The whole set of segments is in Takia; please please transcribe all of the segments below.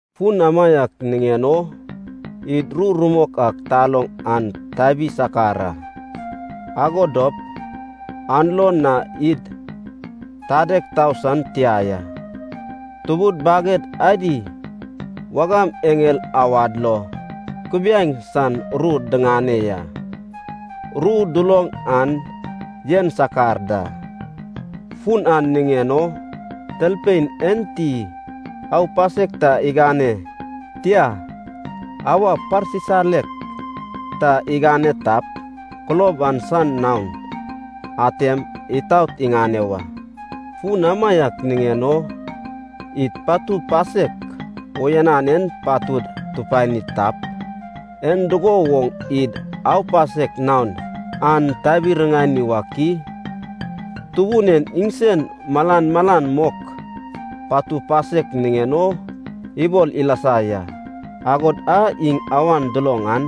Fun amaiak niŋen o id ru rumok a taloŋ an tabi sakar a, ago dop an lo na id tadeg tau san tia ya. Tubud baged adi wagam eŋel awad lo kubiaeŋ san ru diŋane ya. Ru duloŋ an yen sakar da, fun an niŋen o talpein enti aupasek ta igane, tia, awa parsisalek ta igane tap, kulob an san naon atem itaot iŋane wa. Fun amaiak niŋen o id patu pasek uyanan en patud tupani tap, en dugo woŋ id aupasek naon an tabi-riŋani wak i? Tubun en iŋsen malan malan mok patu pasek niŋen o ibol ilasa ya, agod a iŋ awan duloŋ an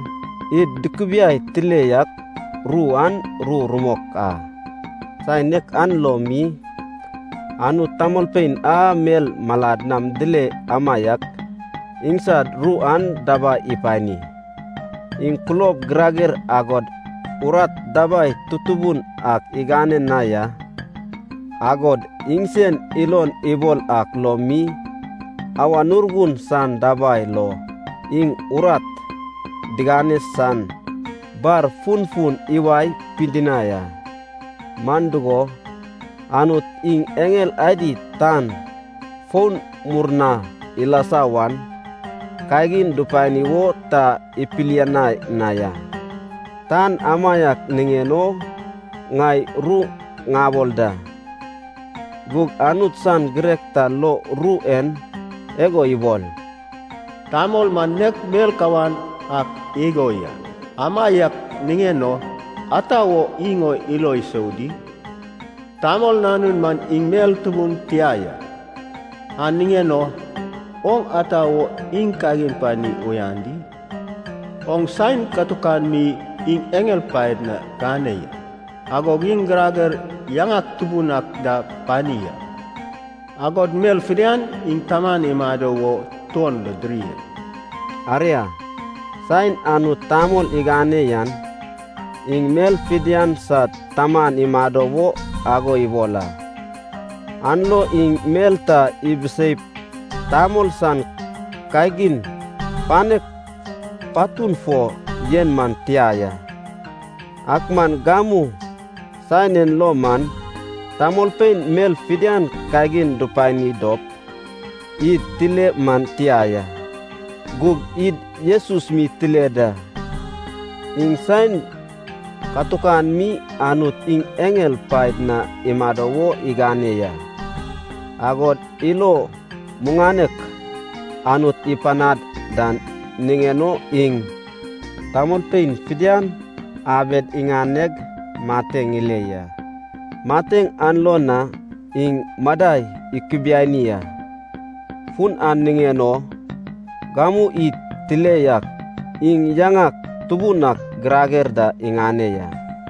id dukubiai tile yak ru an ru rumok a. Saen nek an lo mi Anut tamolpein a mel malad nam dile amaiak iŋsad ru an dabai ipani. Iŋ kulob girager agod urat dabai tutubun ak igane na ya, agod iŋsen ilon ibol ak lo mi Awan Urgun san dabai lo iŋ urat digane san bar funfun iwae pidinai a. Man dugo, Anut iŋ eŋel adi tan foun murna ilasa wan kagin dupani wo ta ipilianai na ya. Tan amaiak niŋen o ŋai ru ŋabol da. Gug Anut san girek ta lo ru en igo ibol, “Tamol man nek mel kawan ak igo ya, amaiak niŋen o, ata wo iŋ o ilo isou di? Tamol nanun man iŋ mel tubun tia ya, an niŋen o oŋ ata wo iŋ kagin pani uyan di? Oŋ saen katukan mi iŋ eŋel paed na gane ya, agog iŋ girager yaŋak tubun ak da pani a, agod mel fidian iŋ taman imado wo tuon lo diri a.” Aria, saen Anut tamol igane yan, iŋ mel fidian sad taman imado wo ago ibol a, an lo iŋ mel ta ibiseip tamol san kagin panek patun fo yen man tia ya. Ak man gamu saen en lo man tamolpein mel fidian kagin dupani dop id tile man tia ya. Gug id Jesus mi tile da, iŋ saen katukan mi Anut iŋ eŋel paed na imado wo igane ya. Agod ilo muŋanek Anut ipanad dan niŋen o iŋ tamolpein fidian abed iŋaneg mateŋ ile ya. Mateŋ an lo na iŋ madai ikubiani a, fun an niŋen o gamu id tile yak iŋ yaŋak tubun ak girager da iŋane ya.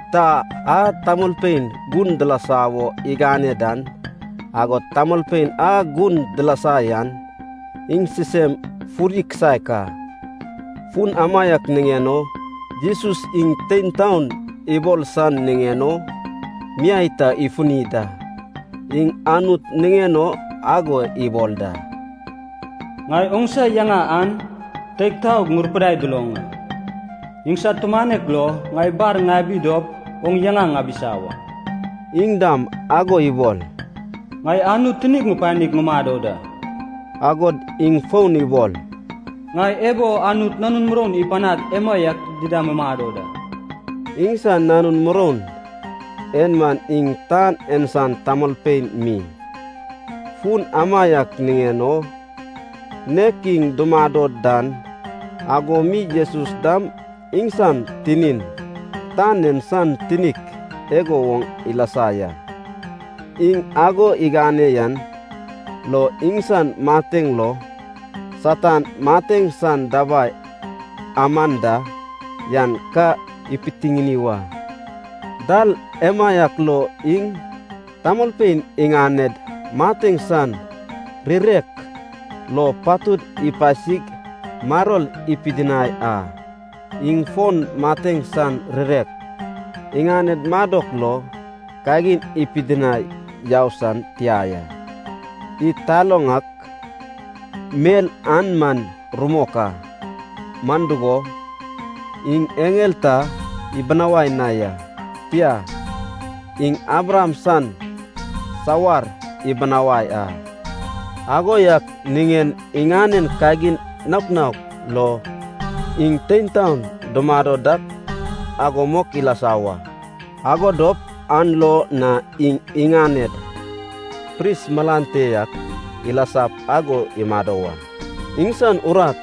Ta a tamolpein gun dilasa wo igane dan, agod tamolpein a gun dilasa yan, iŋ sisem fudi kisaek a. Fun amaiak niŋen o Jesus iŋ tein taon ibol san niŋen o miai ta ifuni da. Iŋ Anut niŋen o ago ibol da, “Ŋai oŋsa yaŋa an teig taog ŋurupidai duloŋ a, iŋsad tumanek lo ŋai bar ŋabi dop oŋ yaŋa ŋabisa wa.” Iŋ dam ago ibol, “Ŋai Anut tinig ŋupanig ŋumado da,” agod iŋ fon ibol, “Ŋai ebo Anut nanun muroun ipanag emaiak dida mumado da.” Iŋsan nanun muroun en man iŋ tan en san tamolpein mi, fun amaiak niŋen o nek iŋ dumado dan ago mi Jesus dam iŋsan tinin, tan en san tinik igo woŋ ilasa ya. Iŋ ago igane yan lo iŋsan mateŋ lo Satan mateŋ san dabai aman da yan ka ipitiŋini wa. Dal emaiak lo iŋ tamolpein iŋaned mateŋ san rirek lo patud ipasig maror ipidinai a, iŋ fon mateŋ san rirek iŋaned madok lo kagin ipidinai yau san tia ya. Id taloŋ ak mel an man rumok a, man dugo, iŋ eŋel ta ibinawai na ya, tia, iŋ Abraham san sawar ibinawai a. Ago yak niŋen iŋanen kagin naok naok lo iŋ tein taon dumado dak ago mok ilasa wa. Ago dop an lo na iŋ iŋaned pris malan te yak ilasap ago imado wa. Iŋsan urat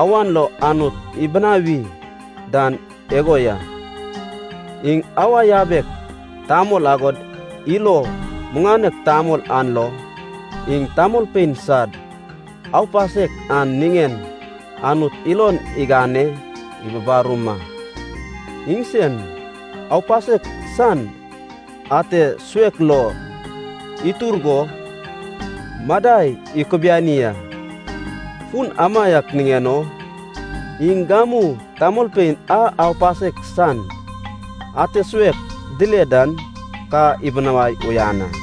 awan lo Anut ibinawi dan igo ya, iŋ awa yabek tamol agod ilo muŋanek tamol an lo iŋ tamolpein sad aupasek an niŋen Anut ilon igane ibubarum a. Iŋsen aupasek san ate suek lo itur go madai ikubiani a, fun amaiak niŋen o iŋ gamu tamolpein a aupasek san ate suek dile dan ka ibinawai uyan a.